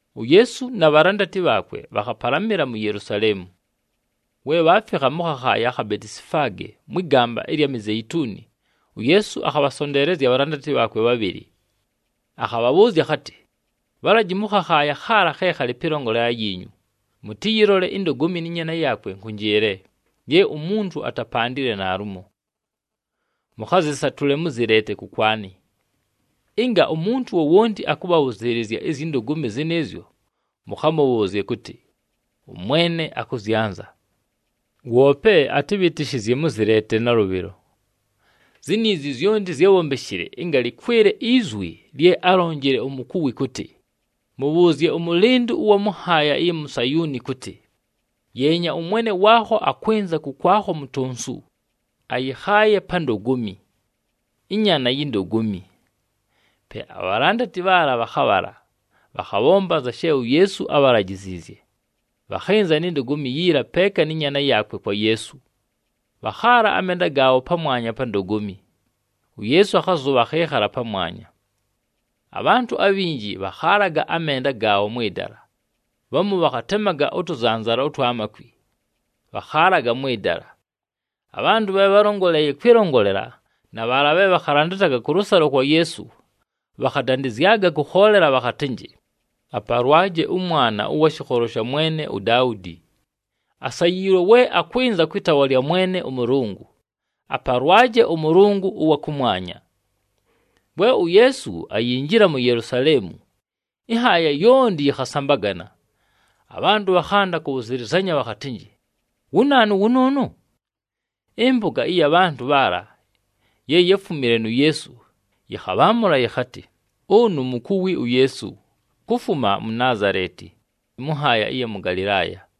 UYeesu na bhalandati bhaakwe bhakhapalamɨla mu Yelusaleemu. We bhaafikha mʉ khakhaaya akha Betisifaage mwɨ gamba ɨlya Mizeituni, uYeesu akhabhasonteelezya abhalandati bhaakwe bhabhɨlɨ. Akhabhabhʉʉzya akhatɨ, “Bhalaji mʉ khakhaaya khaala khe khalɨ pɨlongolela yiinyu, mʉtɨyɨlole indogomi nɨ nyaana yaakwe nkʉnjɨɨle, ye umuntu atapandile naalumo. Mʉkhazɨsatʉle, mʉzɨleete kʉkwanɨ. Ɨnga umuntu wowonti akʉbhabhʉzɨɨlɨzya izyi ndogomi zɨnɨɨzyo, mʉkhamʉbhʉʉzye kʉtɨ, ‘ɄMwene akʉzyanza,’ woope atɨbhɨtɨshɨzye mʉzɨleete nalʉbhɨlo.” Ziniizi zyonti zyábhombeshile ɨnga lɨkwɨle izwi lye álonjile umukuwi kʉtɨ, “Mʉbhʉʉzye ʉmʉlɨndʉ ʉwa mʉ nhaaya ɨya mu Sayuuni kʉtɨ, ‘Yeenya, ʉMwene waakho akwɨnza kʉkwakho, mutonsu, ayɨkhaaye pa ndogomi, ɨnyaana yi ndogomi.’” Pe abhalandati bhaala bhakhabhala, bhakhabhomba anza she uYeesu ábhalajiziizye. Bhakhɨnza ni ndogomi yiila peeka nɨ nyaana yaakwe kwa Yeesu, bhakhaala amenda gaabho pamwanya pa ndogomi, uYeesu akhazʉbha, akhɨɨkhala pamwanya. Abhantʉ abhinji bhakhaalaga amenda gaabho mwɨ dala, bhamu bhakhatemaga ʉtʉzanzala ʉtwa makwi, bhakhaalaga mwɨ dala. Abhantʉ bhe bhálongoleeye kwɨlongolela na bhaala bhe bhakhalandataga kʉlʉsalo kwa Yeesu, bhakhadandɨzyaga kʉkhoolela bhakhatɨnjɨ, “Apalwaje ʉMwana ʉwa shɨkholo sha mwene uDaudi! Asayiilwe we akwɨnza kwɨ taawa lya Mwene ʉMʉlʉngʉ! Apalwaje ʉMʉlʉngʉ ʉwa kʉmwanya!” We uYeesu ayinjila mu Yelusaleemu, ɨnhaaya yonti yɨkhasambagana. Abhantʉ bhakhanda kʉbhʉzɨlɨzanya bhakhatɨnjɨ, “Wu naanu wʉnʉʉnʉ?” Ɨmpʉga ɨya bhantʉ bhaala ye yáfumile nu Yeesu yɨkhabhaamʉla yɨkhatɨ, “Ʉnʉ mukuwi uYeesu, kufuma mu Naazaleti, mʉ nhaaya ɨya mʉ Galɨlaaya.”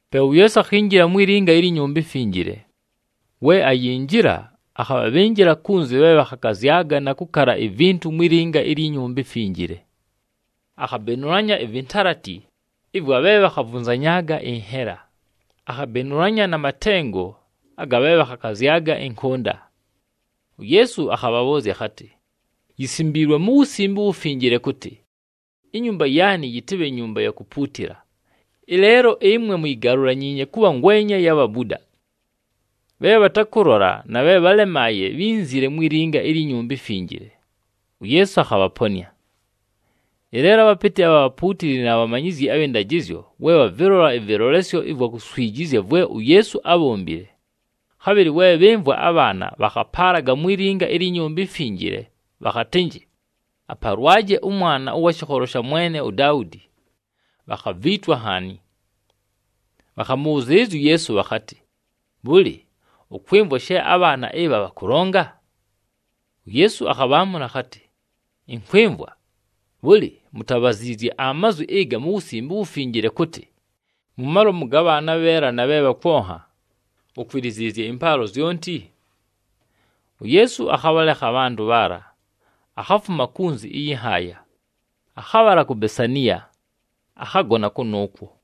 Pe uYeesu akhinjila mwi linga ilyi Nyumba iMfinjile. We ayinjila, akhabhabhɨnjɨla kunzi bhe bhakhakazyaga na kʉkala ivintu mwi linga ilyi Nyumba iMfinjile. Akhabenulanya ivintalati ɨvwa bhe bhakhavunzanyaaga ɨnhela, akhabenulanya na matengo aga bhe bhakhakazyaga ɨnkʉnda. UYeesu akhabhabhʉʉzya akhatɨ, “Yisimbiilwe mu Wusimbe uWufinjile kʉtɨ, ‘Inyumba yaanɨ yɨtɨbhe nyumba ya kupuutila.’ Ɨleelo ɨmwe muyigalulanyiinye kʉbha ngwenya ya bhabuda!” Bhe bhatakʉlola na bhe bhálemaaye bhínzile mwi linga ilyi Nyumba iMfinjile, uYeesu akhabhaponɨa. Ɨleelo abhapɨtɨ abha bhapuutili na bhamanyizyi abhɨ ndajɨzyo we bhavɨlola ɨvɨlolesyo ɨvwa kuswijizya vwe uYeesu ábhombile, khabhɨlɨ we bhɨmvwa abhaana bhakhapaalaga mwi linga ilyi Nyumba iMfinjile bhakhatɨnjɨ, “Apalwaje ʉMwana ʉwa shɨkholo sha mwene uDaudi,” bhakhaviitwa nhaani. Bhakhamʉbhʉzɨɨlɨzya uYeesu bhakhatɨ, “Bhʉlɨ, ʉkwɨmvwa she abhaana ɨbha bhakʉlonga?” UYeesu akhabhaamʉla akhatɨ, “Ɨnkwɨmvwa. Bhʉlɨ, mutabhaziizye amazwi ɨga mu Wusimbe uWufinjile kʉtɨ, ‘Mu malomu ga bhaana abheela na bhe bhakwonha, ukwiliziizye ɨmpaalo zyonti’?” UYeesu akhabhalekha abhantʉ bhaala, akhafuma kunzi ɨyɨ nhaaya, akhabhala ku Besaniya, akhagona kʉnʉʉkwo.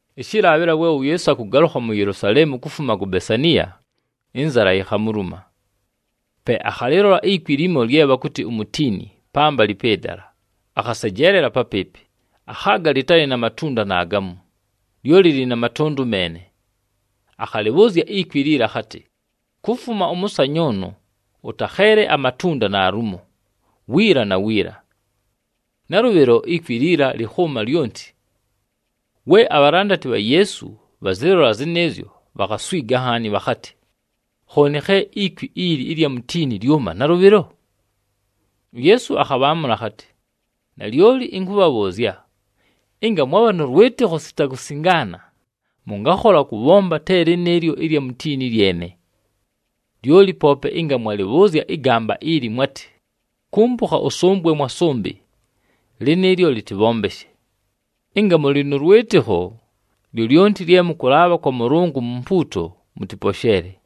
Ɨshɨlaabhɨla we uYeesu akʉgalʉkha mu Yelusaleemu kufuma ku Besaniya, ɨnzala yikhamuluma. Pe akhalɨlola ikwi limo lye bhakʉtɨ umutiini pambalɨ pɨ dala, akhasejeelela papɨɨpɨ, akhaaga lɨtalɨ na matunda naagamu, lyoli lɨlɨ na matʉndʉ meene. Akhalɨbhʉʉzya ikwi liila akhatɨ, “Kufuma ʉmʉsanyʉʉnʉ ʉtakheele amatunda naalumo, wiila na wiila!” Nalʉbhɨlo, ikwi liila lɨkhʉʉma lyonti. We abhalandati bha Yeesu bhazɨlola zɨnɨɨzyo, bhakhaswiga nhaani, bhakhatɨ, “Khooni khe ikwi ili ɨlya mutiini lyʉma nalʉbhɨlo?” UYeesu akhabhaamʉla akhatɨ, “Nalyoli ɨnkʉbhabhʉʉzya, ɨnga mwabha nʉ lwɨtɨkho sita kusingaana, mʉngakhola kʉbhomba te lɨnɨɨlyo ɨlya mutiini lyene. Lyoli poope ɨnga mwalɨbhʉʉzya ɨgamba ili, mwatɨ, ‘Kumpukha ʉsʉmbwe mwa sʉmbɨ,’ lɨnɨɨlyo lɨtɨbhombeshe. Ɨnga mʉlɨ nʉ lwɨtɨkho, lyolyonti lye mʉkʉlaabha kwa Mʉlʉngʉ mu mpuuto, mʉtɨposheele.”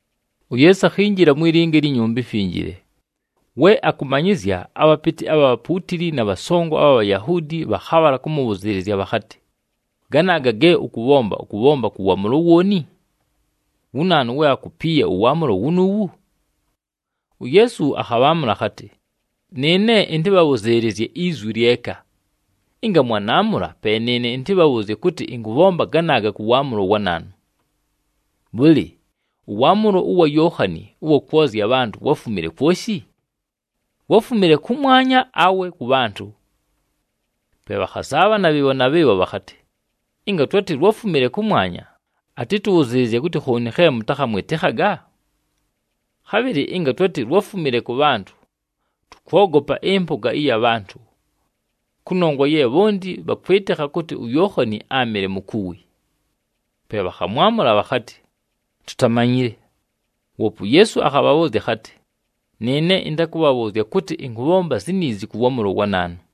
UYeesu akhinjila mwi linga ilyi Nyumba iMfinjile. We akʉmanyɨzya, abhapɨtɨ abha bhapuutili na bhasongo abha Bhayahuudi bhakhabhala kʉmʉbhʉzɨɨlɨzya bhakhatɨ, “Ganaaga ge ʉkʉbhomba, ʉkʉbhomba kʉ waamʉlo wooni? Wu naanu we akupiiye ʉwaamʉlo wunuuwu?” UYeesu akhabhaamʉla akhatɨ, “Nɨɨne ɨntɨbhabhʉzɨɨlɨzye izwi lyeka. Ɨnga mwanaamʉla, pe nɨɨne ɨntɨbhabhʉʉzye kʉtɨ ɨnkʉbhomba ganaaga kʉ waamʉlo wa naanu. Bhʉlɨ, ʉwaamʉlo wa Yookhani ʉwa kwozya abhantʉ wáfumile kwoshi? Wáfumile kʉmwanya awe kʉ bhantʉ?” Pe bhakhazaabhana bhɨɨbho na bhɨɨbho bhakhatɨ, “Ɨnga twatɨ lwáfumile kʉmwanya, atɨtʉbhʉzɨɨlɨzye kʉtɨ, ‘Khooni khe mʉtakhamwɨtɨkhaga?’ Khabhɨlɨ ɨnga twatɨ lwáfumile kʉ bhantʉ, tʉkwogopa ɨmpʉga ɨya bhantʉ. Kʉnongwa ye bhonti bhakwɨtɨkha kʉtɨ uYookhani áamɨle mukuwi.” Pe bhakhamwamʉla bhakhatɨ, “Tutamanyile.” Woope uYeesu akhabhabhʉʉzya akhatɨ, “Nɨɨne ɨntakʉbhabhʉʉzya kʉtɨ ɨnkʉbhomba ziniizi kʉ waamʉlo wa naanu.”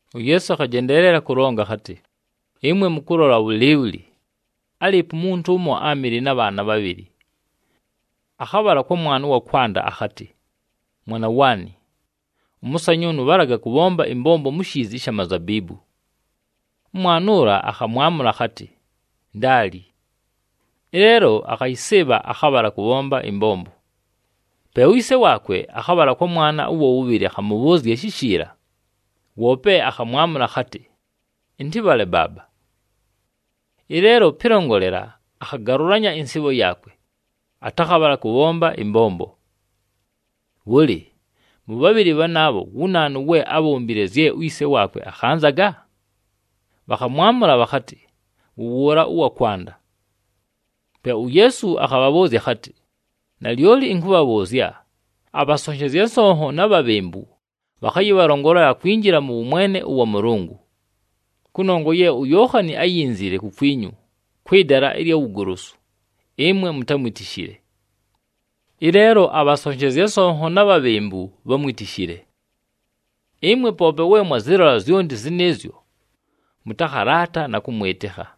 UYeesu akhajendeelela kʉlonga akhatɨ, “Ɨmwe mʉkʉlola bhʉlɨɨbhʉlɨ? Álɨɨpo umuntu ʉmo áamɨle na bhaana bhabhɨlɨ. Akhabhala kwa mwana ʉwa kwanda, akhatɨ, ‘Mwana waanɨ, ʉmʉsanyʉʉnʉ bhalaga kʉbhomba ɨmbombo mu shiizi ɨsha mazabiibu.’ Ʉmwana ʉla akhamwamʉla akhatɨ, ‘Ndaali.’ Ɨleelo akhayɨsɨɨbha, akhabhala kʉbhomba ɨmbombo. Pe uyise waakwe akhabhala kwa mwana ʉwa wʉbhɨlɨ akhamʉbhʉʉzya shishiila. Woope akhamwamʉla akhatɨ, ‘Ɨntɨbhale baaba.’ Ɨleelo pɨlongolela, akhagalʉlanya ɨnsɨɨbho yaakwe, atakhabhala kʉbhomba ɨmbombo. Bhʉlɨ, mʉ bhabhɨlɨ bhanaabho, wu naanu we ábhombile zye uyise waakwe akhanzaga?” Bhakhamwamʉla bhakhatɨ, “Wʉ wʉʉla ʉwa kwanda.” Pe uYeesu akhabhabhʉʉzya akhatɨ, “Nalyoli ɨnkʉbhabhʉʉzya, abhasonshezya nsonho na bhabhembu bhakhayɨbhalongolela kwinjila mʉ wʉmwene ʉwa Mʉlʉngʉ. Kʉnongwa ye uYookhani áyinzile kukwinyu kwɨ dala ɨlya wugolosu, ɨmwe mutámwitishile. Ɨleelo abhasonshezya nsonho na bhabhembu bhámwitishile. Ɨmwe poope we mwazɨlola zyonti zɨnɨɨzyo, mʉtakhalaata na kʉmwɨtɨkha.”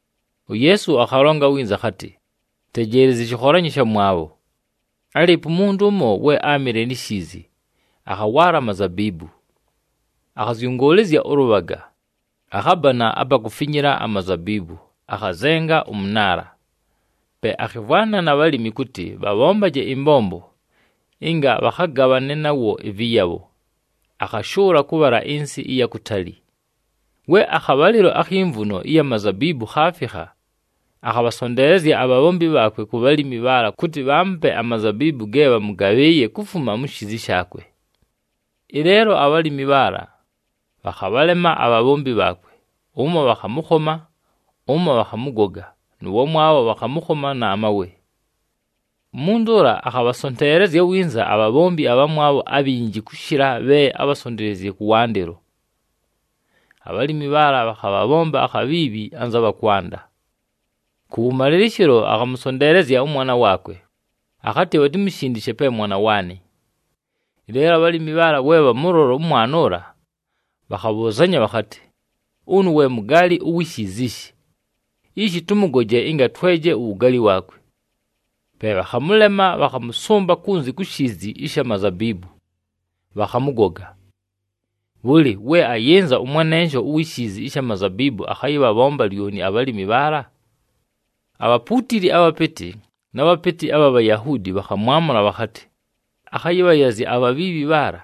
UYeesu akhalonga winza akhatɨ, “Tejeelezyi ɨshɨkholanyo ɨshamwabho. Álɨɨpo umuntu ʉmo, we áamɨle ni shiizi, akhawaala amazabiibu. Akhazyʉngʉʉlɨzya ʉlʉbhaga, akhabana apa kufinyila amazabiibu, akhazenga ʉmʉnaala. Pe akhɨmvwana na bhalimi kʉtɨ bhabhombaje ɨmbombo ɨnga bhakhagabhane nawo ɨvɨyabho, akhashʉʉla kʉbhala ɨnsɨ ɨya kutali. “We akhabhalɨlo akhi mvuno ɨya mazabiibu khaafikha, akhabhasonteelezya abhabhombi bhaakwe ku bhalimi bhaala kʉtɨ bhaamupe amazabiibu ge bhamʉgabhɨɨye kufuma mu shiizi shaakwe. Ɨleelo abhalimi bhaala bhakhabhalema abhabhombi bhaakwe, ʉmo bhakhamʉkhoma, ʉmo bhakhamʉgoga nʉ wamwabho bhakhamʉkhoma na mawe. Umuntu ʉla akhabhasonteelezya winza abhabhombi abhamwabho abhinji kʉshɨla bhe ábhasonteleziizye kʉwandɨlo. Abhalimi bhaala bhakhabhabhomba akhabhiibhi anza bha kwanda. Kʉwʉmalɨlɨshɨlo, akhamʉsonteelezya ʉmwana waakwe akhatɨ, ‘Bhatimushindishe pe mwana waanɨ.’ Ɨleelo abhalimi bhaala we bhamʉlola ʉmwana ʉla, bhakhabhʉʉzanya bhakhatɨ, ‘Ʉnʉ, we mugaali uwi shiizi ishi. Ishi tʉmʉgoje ɨnga tweje uwugaali waakwe.’ Pe bhakhamʉlema, bhakhamʉsʉmba kunzi ku shiizi ɨsha mazabiibu, bhakhamʉgoga. Bhʉlɨ, we ayɨnza ʉmwanensho uwi shiizi ɨsha mazabiibu akhayɨbhabhomba lyoni abhalimi bhaala?” Abhapuutili abhapɨtɨ na bhapɨtɨ abha Bhayahuudi bhakhamwamʉla bhakhatɨ, “Akhayɨbhayazya abhabhiibhi bhaala,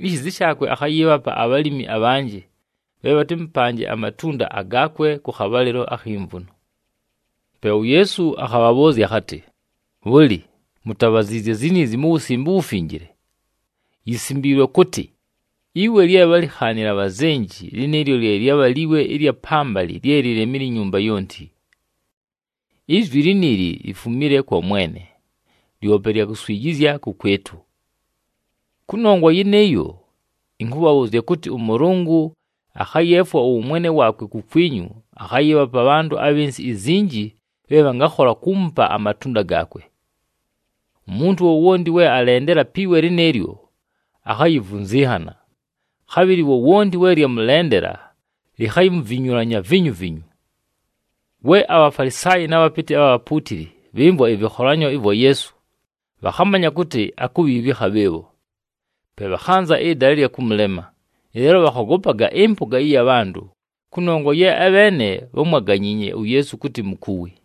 ishiizi shaakwe akhayɨɨbhapa abhalimi abhanjɨ bhe bhatɨmʉpanje amatunda agaakwe kʉ khabhalɨlo akhi mvuno.” Pe uYeesu akhabhabhʉʉzya akhatɨ, “Bhʉlɨ, mutabhaziizye ziniizi mu Wusimbe uWufinjile? Yisimbiilwe kʉtɨ, ‘Iwe lye bhálikhaanile abhazenji, lɨnɨɨlyo lye lyabha liwe ɨlya pambalɨ, lye lilemile inyumba yonti. Izwi liniili lifumile kwa Mwene, lyope lya kuswijizya kʉkwɨtʉ!’ “Kʉnongwa yɨnɨɨyo, ɨnkʉbhabhʉʉzya kʉtɨ, ʉMʉlʉngʉ akhayeefwa ʉwʉmwene waakwe kukwinyu akhayɨɨbhapa abhantʉ abhɨ nsɨ izinji bhe bhangakhola kuumupa amatunda gaakwe. Umuntu wowonti we alendela pi we lɨnɨɨlyo, akhayivunzinhana. Khabhɨlɨ wowonti we lyamʉlendela, likhayimuvinyulanya vinyuvinyu.” We aBhafalisaayi na bhapɨtɨ abha bhapuutili bhɨmvwa ɨvɨkholanyo vwa Yeesu, bhakhamanya kʉtɨ akubhiibhikha bhɨɨbho. Pe bhakhanza ɨdala ɨlya kʉmʉlema, ɨleelo bhakhogopaga ɨmpʉga ɨya bhantʉ, kʉnongwa ye abheene bhámwaganyiinye uYeesu kʉtɨ mukuwi.